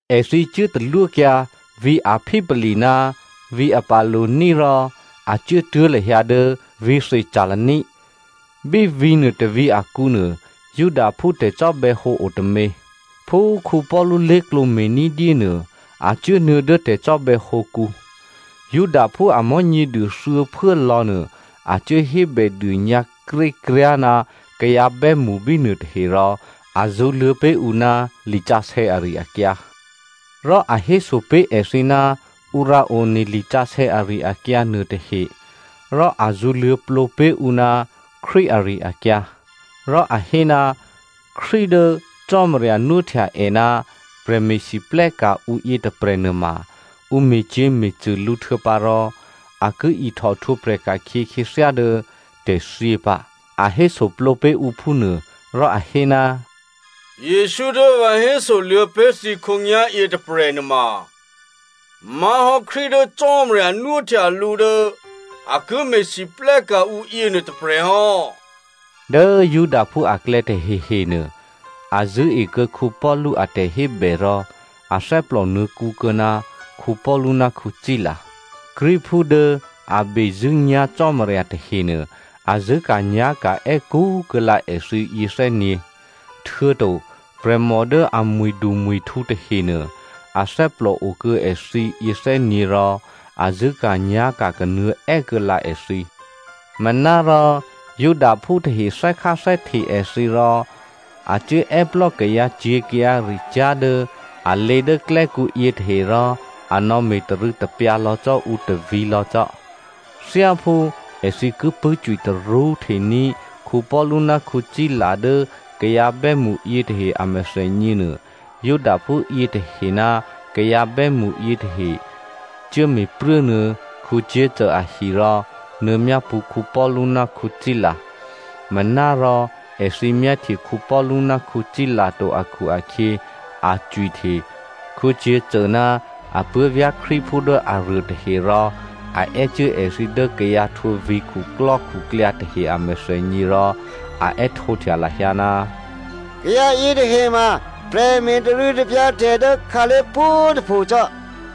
Èthǐ cuốtalwókyǎ vǐ̤ Amphipoli ná vǐ̤ Apollonia rò a cuốtuố̤ lahyǎ dố vǐ̤ Thessalonia. Bí vǐ̤nuô tôvǐ̤ akǔnuô, Judaphú tè̤cò́bè̌hǒ o tômě. Phú Paulu lé̤klǒ me̤ ní̤dyé nuô, a cuốnuô̌ dố tè̤cò́bè̌hǒkǔ. Judaphú a Mò̤́nyěduô thuô̌phuố lò̌nuô a cuố hébèdônyǎ krékryá̤ ná kayǎ bè́mṳ bínuô tahe rò a zṳ̌luô̌ pé̤ ǔ ná lisǎsè̌ ari-akyǎ. Rò a héso pé̤ èthǐ ná ǔ rǎone lisǎsè̌ ari-akyǎ nuôtahe rò a zṳ̌luô̌plǒ pé̤ ǔ ná Krístu ari-akyǎ. Rò a hé, Krístu dố Cò́marya nwóhtya è ná prè̤me̤lwóhteka̤ ǔ yětôprè̤ nuôma ǔ me̤cyě̤me̤cṳ̂ lǔ htuô̌pǎrò a ki ihtò htwǒprè̤ ka̤khyě khyěthyá dố tè̤thyě pǎ a hésoplǒ pé̤ ǔ phúnuô. Rò a hé, “Jesǔ dố vǎ hésoluô̌ pé̤ thǐ khǒnyá̤yě tôprè̤ nuôma má̤hò́ Krístu dố Cò́marya nwóhtya lǔ dố a ki me̤lwóhteka̤ ǔ yěnuô tôprè̤ hò́.” Dố Judaphú aklè̌ tahehenuô, a zṳ̂́ekuô̌ Paulu a tè̤hébè rò athè́plò nuô̌kǔ kuô̌ná Paulu ná Sila. Greekphú dố a bezṳ̂́nyá̤ Cò́marya tahenuô a zṳ̂́ka̤nyá̤ka̤ è́kú kuô̌lǎ èthǐ yěthè́nyě̤, htuô̌to prè̤mò dố a mwi̤dumwi̤htǔ tahenuô, athè́plò okuô̌ èthǐ yěthè́nyě̤ rò a zṳ̂́ka̤nyá̤ka̤ kanuô̌ è́kuô̌ lǎ èthǐ. Manárò Judaphú tahe thè́kháthè́hte èthǐ rò a cuốè́plò́ kayǎcyě̤ kayǎricyá̤ dố a lě dố klè́kǔ yětahe rò a nò̌me̤ tarû̌tapyǎ lò̌ cò́ ǔ tôvǐ̤lò̌ cò́. Thyáphú èthǐ ki pṳ̂́cwitarṳ́ htení̤ Paulu ná Sila dố kayǎ bè́mṳ yětahe a mèthènyěnuô, Judaphú yětahe ná kayǎ bè́mṳ yětahe cuố me̤pruốnuô̌ Jason ahi rò nuô̌myápṳ̌ Paulu ná Sila. Manárò èthǐ myáhtye Paulu ná Sila to akhu-akhyě a cwihte Jason ná apuố̤vyá̤ Krístuphú dố aruô tahe rò a è́cuố èthǐ dố kayǎ htwǒ vǐ̤khuklò́khuklyǎ tahe a mèthènyě rò a è́htǒhtya lahyǎ, “Kayǎ yětahe ma, prè̤me̤ tarû̌tapyǎ tè̤ dố khǎlé̤ pwǒ̤꤮ tôpho cò́.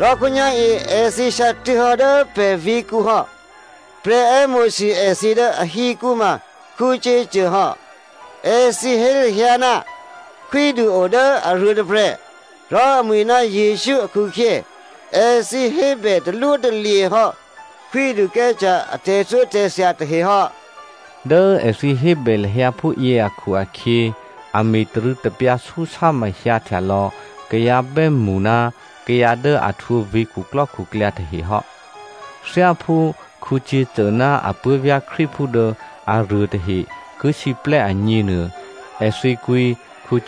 Rò khǒnyá̤yě èthǐ hyǎtuố̤hò́ dố pè̤ vǐ̤kǔ hò́. Prè̤ è́mo̤sû èthǐ dố ahikǔ ma Jason hò́. Èthǐ hé lahyǎ ná khwídu o dố aruô tôprè̤, rò amwi̤ ná Jesǔ akhu-akhyě, èthǐ hébè talwótalye̤ hò́ Khwídu Caesare a tè̤thyótè̤thya tahe hò́.” Dố èthǐ hébè lahyǎ phúyě akhu-akhyě a me̤tarû̌tapyǎ súsámahyǎ htyalò̌ kayǎ bè́mṳ ná kayǎ dố a htwǒ vǐ̤khuklò́khuklyǎ tahe hò́. Thyáphú Jason ná apuố̤vyá̤ Krístuphú dố aruô tahe ki siplè́ agněnuô, èthǐ kwǐ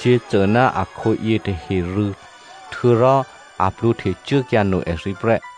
Jason ná akhǒ yětahe rû̌, htuô̌rò a plwǒhtecuốkyǎ no èthǐ prè́.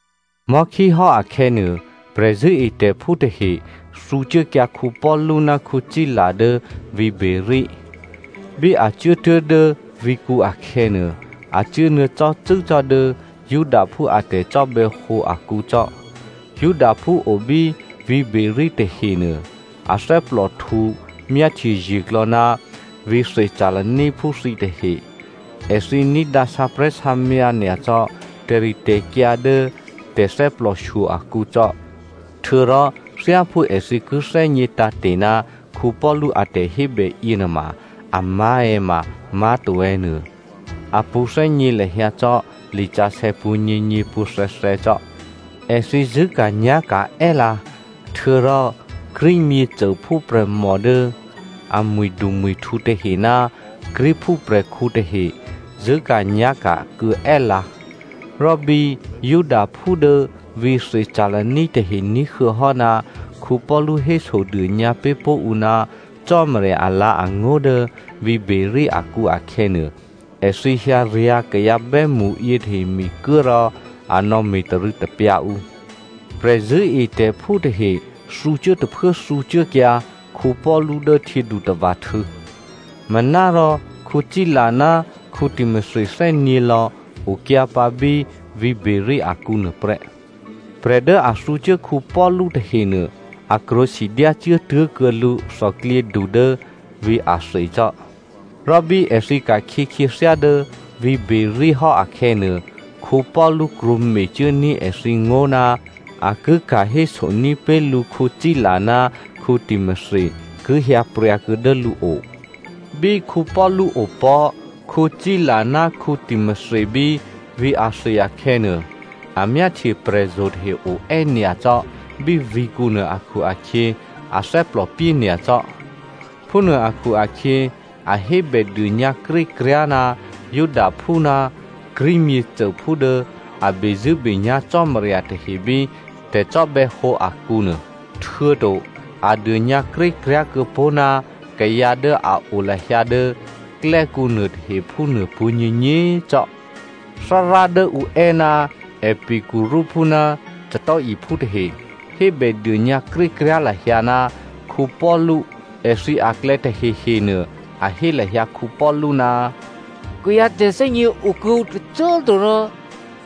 Mò̤́khíhò́ akhè̌nuô, prè̤zṳ̂́etè̤phú tahe thǔcuốkyǎ Paulu ná Sila dố vǐ̤ Beroea. Bí a cuốtuố̤ dố vǐ̤kǔ akhè̌nuô, a cuốnuô̌ cò́cû́ cò́ dố Judaphú a tè̤cò́bè̌hǒ akǔ cò́. Judaphú o bí vǐ̤ Beroea tahenuô a thè́plòhtǔ myáhtyeye̤klò̌ ná vǐ̤ Thessaloniaphú thǐtahe. Èthǐ ní̤dǎ sǎprè̤́sǎmyǎ nyacò́ tè̤ritè̤kyǎ dố tè̤thè́plòshyo akǔcò́. Htuô̌rò thyáphú èthǐ ki thè́gně tǎ̤te̤ ná Paulu a tè̤hébè yěnuôma, amá̤ è̌ ma má̤to è̌ nuô a pṳ̌thè́gně lahyǎ cò́ lisǎsè̌ pwǒ̤nyěnyě pwǒ̤thè̌thè̌ cò́. Èthǐ zṳ̂́ka̤nyá̤ka̤ è́lǎ, htuô̌rò Greek myěcôphú prè̤mò dố a mwi̤dumwi̤htǔ tahe ná Greekphú prè̤khǔ tahe zṳ̂́ka̤nyá̤ka̤ kuô̌ è́lǎ. Rò bí Judaphú dố vǐ̤ Thessalonia tahe ní̤huô̌hò́ ná Paulu hésodônyǎ pé̤ pó̤ ǔ ná Cò́marya alǎ̤angó̤ dố vǐ̤ Beroea akǔ akhè̌nuô, èthǐ hyǎryǎ̤ kayǎ bè́mṳ yětahe mikuố rò a nò̌ me̤tarû̌tapyǎ ǔ. Prè̤zṳ̂́etè̤phú tahe thǔcuố tôphuố thǔcuốkyǎ Paulu dố htyědutava̤htû̌, manárò Sila ná Timothy thè́nyě̤lò̌ okyǎpǎ bí vǐ̤ Beroea akǔ nuôprè́. Prè̤ dố a thǔcuố Paulu tahenuô, a krwǒ sidyácuố tuố̤kuô̌ lǔ thòklyědu dố vǐ̤ Athenia cò́. Rò bí èthǐ ka̤khyě khyěthyá dố vǐ̤ Beroea hò́ akhè̌nuô, Paulu krwǒmecuốní̤ èthǐ ngó̤ ná a ki ka̤héso ní̤pé̤ lǔ Sila ná Timothy ki hyǎpryǎkuô̌ dố lǔo. Bí Paulu opò̤́ Sila ná Timothy bí vǐ̤ Athenia akhè̌nuô, a myáhtye prè̤zo̤ tahe oè́ nyacò́ bí vǐ̤kǔnuô akhu-akhyě a thè́plòpyé nyacò́. Phúnuô akhu-akhyě, a hébèdônyǎ krékryá̤ ná Judaphú ná Greek myěcôphú dố a bezṳ̂́benyá̤ Cò́marya tahe bí tè̤cò́bè̌hǒ akǔ nuô, htuô̌to a dônyǎkrékryá̤ kuô̌pó̤ ná kayǎ dố a o lahyǎ dố klè́kǔ nuôtahe phúnuô pwǒ̤nyěnyě꤮ cò́. Thárá dố ǔ è́, Epicureaphú ná Stoicphú tahe hébèdônyǎ krékryá̤ lahyǎ ná Paulu. Èthǐ aklè̌ tahehenuô, a hé lahyǎ Paulu, “Kayǎ tè̤thè́gně okuô̌ǔ tôcô꤮ to rò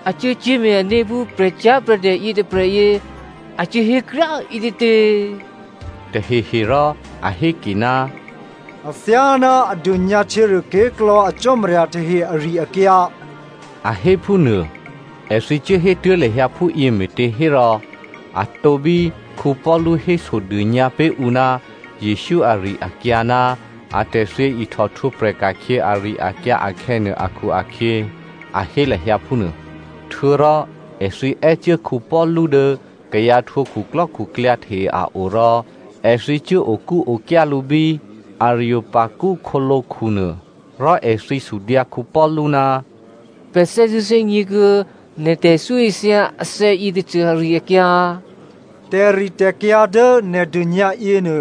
a cuốcyé̤me̤ ané̤ phú prè̤cyá̤prè̤dè yětôprè̤yě a cuố hékryá꤮ ǐtětě?” Tahehe rò a héke, “A thyáná a dônyǎ htyěruôké̤klò̌ a cò́marya tahe ari-akyǎ,” a hé phúnuô. Èthǐ cuốhétuố̤ lahyǎ phúyě me̤těhérò a tǒbí Paulu hésodônyǎ pé̤ ǔ ná Jesǔ ari-akyǎ ná atè̤thyě ihtò htwǒprè̤ ka̤khyě ari-akyǎ akhè̌nuô akhu-akhyě a hé lahyǎ phúnuô. Htuô̌rò èthǐ è́cuố Paulu dố kayǎ htwǒ khuklò́khuklyǎ tahe a o rò èthǐ cuố okúokyá lǔ bí Areopago khǒlǒkhunuô, rò èthǐ sudyǎ Paulu, “Pè̤ thè́zṳ̂́ thè́gně kuô̌ nè̤ tè̤ithyóithya athè̌ yětôcô ari-akyǎ. Tè̤ritè̤kyǎ dố nè̤ dônyǎ yěnuô,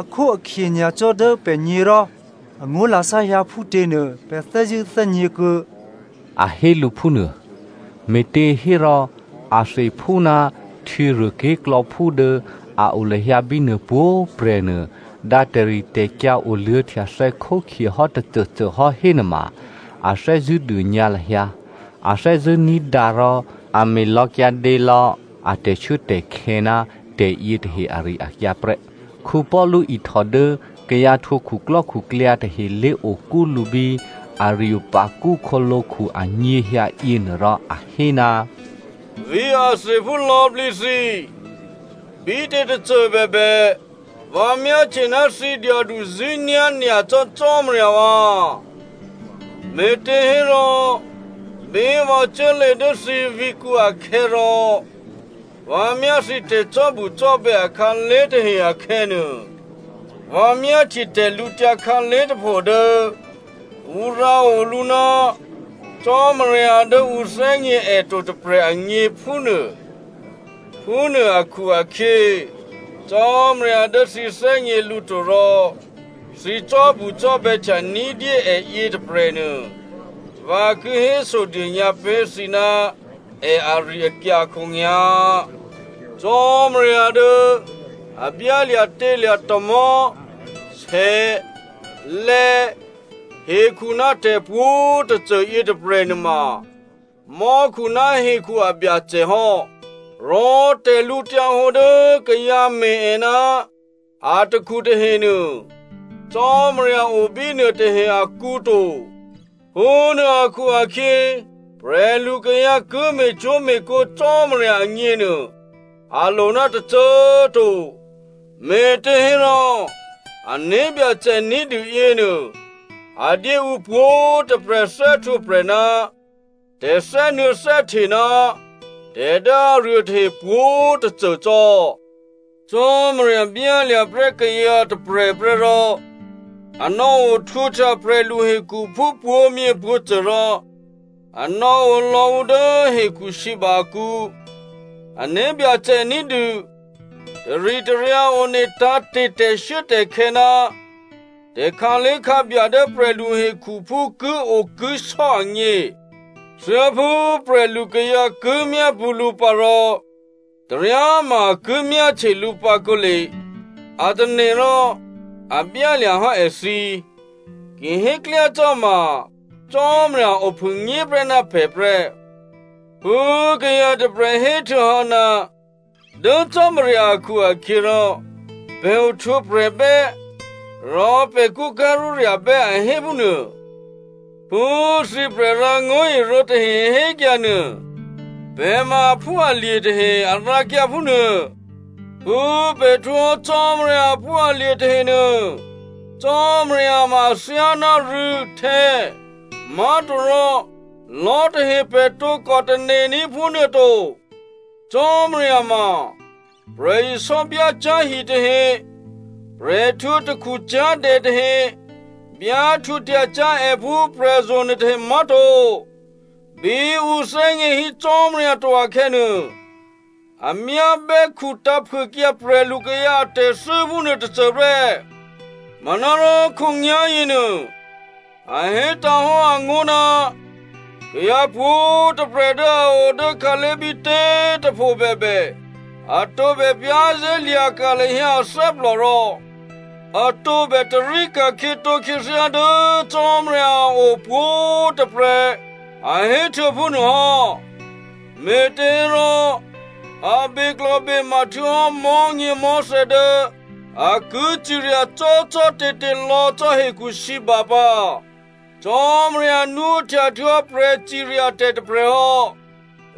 akhóakhye nyacò́ dố pè̤gně rò angó̤lasá hyǎ phútěnuô pè̤ thè́zṳ̂́ thè́gněkuô̌,” a hé lǔ phúnuô. (Me̤těhérò, Atheniaphú ná htyěruôké̤klò̌phú dố a o lahyǎ bínuô pwǒ̤꤮ prè̤nuô, dǎ tè̤ritè̤kyǎ oluô̌htyathè̌ khókhye hò́ tôcôcô hò́ hénuôma, a thè́zṳ̂́ dônyǎ lahyǎ, a thè́zṳ̂́ ní̤dǎ rò a me̤lò̌kyǎdě lò̌ a tè̤shuốtè̤khè̌ ná tè̤yětahe ari-akyǎ prè́.) Paulu ihtò dố kayǎ htwǒ khuklò́khuklyǎ tahe lé̤okú lǔ bí Areopago khǒlǒkhu anyěhyǎ yěnuô rò a hé, “Vǐ̤ Atheniaphú lò̌plǐ thǐ꤮, bítě tôcôbèbè, vǎ myáhtye ná thǐ dyaduzṳ̂́nyá̤ nyacò́ Cò́marya vǎ꤮. Me̤těhérò, bí vǎ cuốlě dố thǐ vǐ̤kǔ akhè̌ rò vǎ myá thǐ tè̤cò́bucò́bè̌ akhǎlé̤ tahe akhè̌nuô, vǎ myáhtye tè̤lǔtyǎ khǎlé̤ tôpho dố ǔ rǎo lǔ, ‘Cò́marya dố ǔ thè́gně è to tôprè̤ agně’ phúnuô. Phúnuô akhu-akhyě, Cò́marya dố thǐ thè́gně lǔ to rò thǐ cò́bucò́bè̌htya ní̤dyé è yětôprè̤nuô, vǎ ki hésodônyǎ pé̤ thǐ ná è ari-akyǎ khǒnyá̤. “Cò́marya dố a byálya̤tělya̤ tamò̤́, sè, lè̌, hekhu ná tè̤pwǒ̤꤮ tôcô yětôprè̤ nuôma mò́khu ná hekhu a Byacè hò́. Rò tè̤lǔhǒdu dố kayǎ me̤ è ná atakhu tahenuô, Cò́marya o bínuôtahe akǔ to. Phúnuô akhu-akhyě prè̤lukayǎ ki me̤cwó̤me̤kǒ Cò́marya agněnuô a lo ná tôcô꤮ to, me̤těhérò, ané̤byacè ní̤dû yěnuô, a dyé ǔ pwǒ̤꤮ tôprè̤ thè́htwǒprè̤ ná tè̤thè́nuô̌thè́hte ná tè̤ dố aruôtahe pwǒ̤꤮ tôcô cò́. Cò́marya byálya̤ prè́ kayǎ tôprè̤ prè́ rò a nò̌ohtwǒhtya prè̤luhekhuphú pwǒ̤myěpwǒ̤cô rò a nò̌olò̌ ǔ dố hekhusǐba akǔ. Ané̤byacè ní̤dû taritaryǎ one tǎ̤te̤ tè̤shuốtè̤khè̌ ná tè̤khǎlé̤khǎbya dố prè̤luhekhuphú kiokisò́ agně. Thyáphú prè̤lukayǎ ki myápṳ̌ lǔ pǎ rò taryáma a ki myáhtye lǔ pǎ kǒle a tane̤ rò a byálya̤hò́ èthǐ. Ki héklyácò́ ma Cò́marya ophûnyéprè́ ná pè̤ prè́. Phú kayǎ tôprè̤ héhtuô̌hò́, ‘Dố Cò́marya akhu-akhyěrò pè̤ ohtwǒprè̤bè́, rò pè̤ kṳ́ká̤rúrya̤bè́,’ a hé phúnuô. Phú thǐ prè̤rǎngó̤irǒ tahe hékyǎ nuô, ‘Pè̤ ma aphúalye̤ tahe,’ a rǎkyǎ phúnuô. “Phú pè̤ htwǒhò́ Cò́marya aphúalye̤ tahenuô, Cò́marya ma athyáná rû̌, htè̌, má̤torò lò̤́ tahe pè̤ tǒkò tane̤ní̤ phúnuôto, Cò́marya ma prè̤isò́ byácyá̤hi tahe, prè̤ htwǒ takhucyá̤dè tahe byá htwǒhtya cyá̤ è phú prè̤zo̤ nuôtahe má̤to. Bí ǔ thè́gně hí Cò́marya to akhè̌nuô, a myá bè́khutǎ̤phuôkyǎ prè̤lukayǎ atè̤thû́ phúnuô tôcô prè́. Manárò khǒnyá̤yěnuô, a hétǎ̤hò́ angó̤ ná kayǎ pwǒ̤꤮ tôprè̤ dố a o dố khǎlé̤ bítě꤮ tôphobèbè a tǒbè za̤ lahyǎ ané̤ rò a tǒbè tarí ka̤khyětǒ khyěthyá dố Cò́marya a o pwǒ̤꤮ tôprè̤ a héhtuô̌ phúnuô hò́. Me̤těhérò, a beklò̤bema htuô̌hò́ mò̤́nyěmò̤́thè̌ dố a ki cirya cò́cò́te̤te̤ lò̌ cò́ hekhusǐba pǎ. Cò́marya nwóhtya htuô̌hò́ prè̤ciryatè̤ tôprè̤ hò́.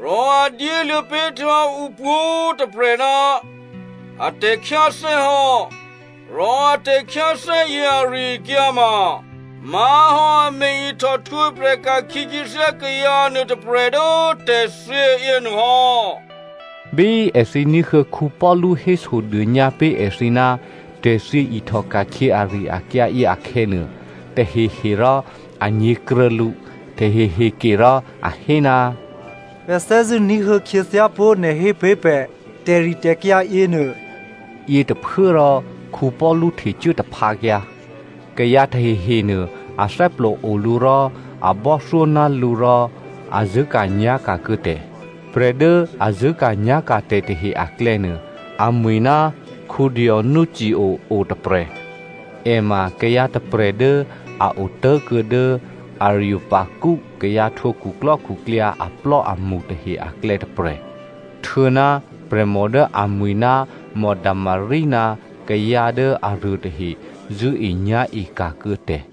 Rò a dyéluô̌ pé̤ htuô̌hò́ ǔpwǒ̤꤮ tôprè̤ ná a tè̤khyáthè́ hò́. Rò a tè̤khyáthè́yě ari-akyǎ ma má̤hò́ a me̤-ihtò htwǒprè̤ ka̤khyě khyěthyá kayǎ nuôtôprè̤ dố tè̤thyě yěnuôhò́.” Bí èthǐ ní̤huô̌ Paulu hésodônyǎ pé̤ èthǐ ná tè̤thyě ihtòka̤khyě ari-akyǎyě akhè̌nuô, tahehe rò a nyě̤kruô̌ lǔ, tahehe kerò a hé, “Pè̤ thè́zṳ̂́ ní̤huô̌ khyěthyápó̤ nè̤ hé pé̤ pè̤ tè̤ritè̤kyǎ yěnuô.” Yětôphuốrò Paulu htecuố taphǎkyǎ. Kayǎ tahehenuô a thè́plòo lǔ rò a bò́thyó ná lǔ rò a zṳ̂́ka̤nyá̤ka̤ kuô̌ tè̤. Prè̤ dố a zṳ̂́ka̤nyá̤ka̤tè̤ tahe aklè̌nuô, amwi̤ ná Dionysio otôprè̤. È ma kayǎ tôprè̤ dố a otố̤kuô̌ dố Areopago kayǎ htwǒ khuklò́khuklyǎ aplò́amṳ tahe aklè̌ tôprè̤. Htuô̌ ná prè̤mò dố amwi̤ ná Damari ná kayǎ dố aruô tahe zṳ̂́enyá̤eka̤ kuô̌ tè̤.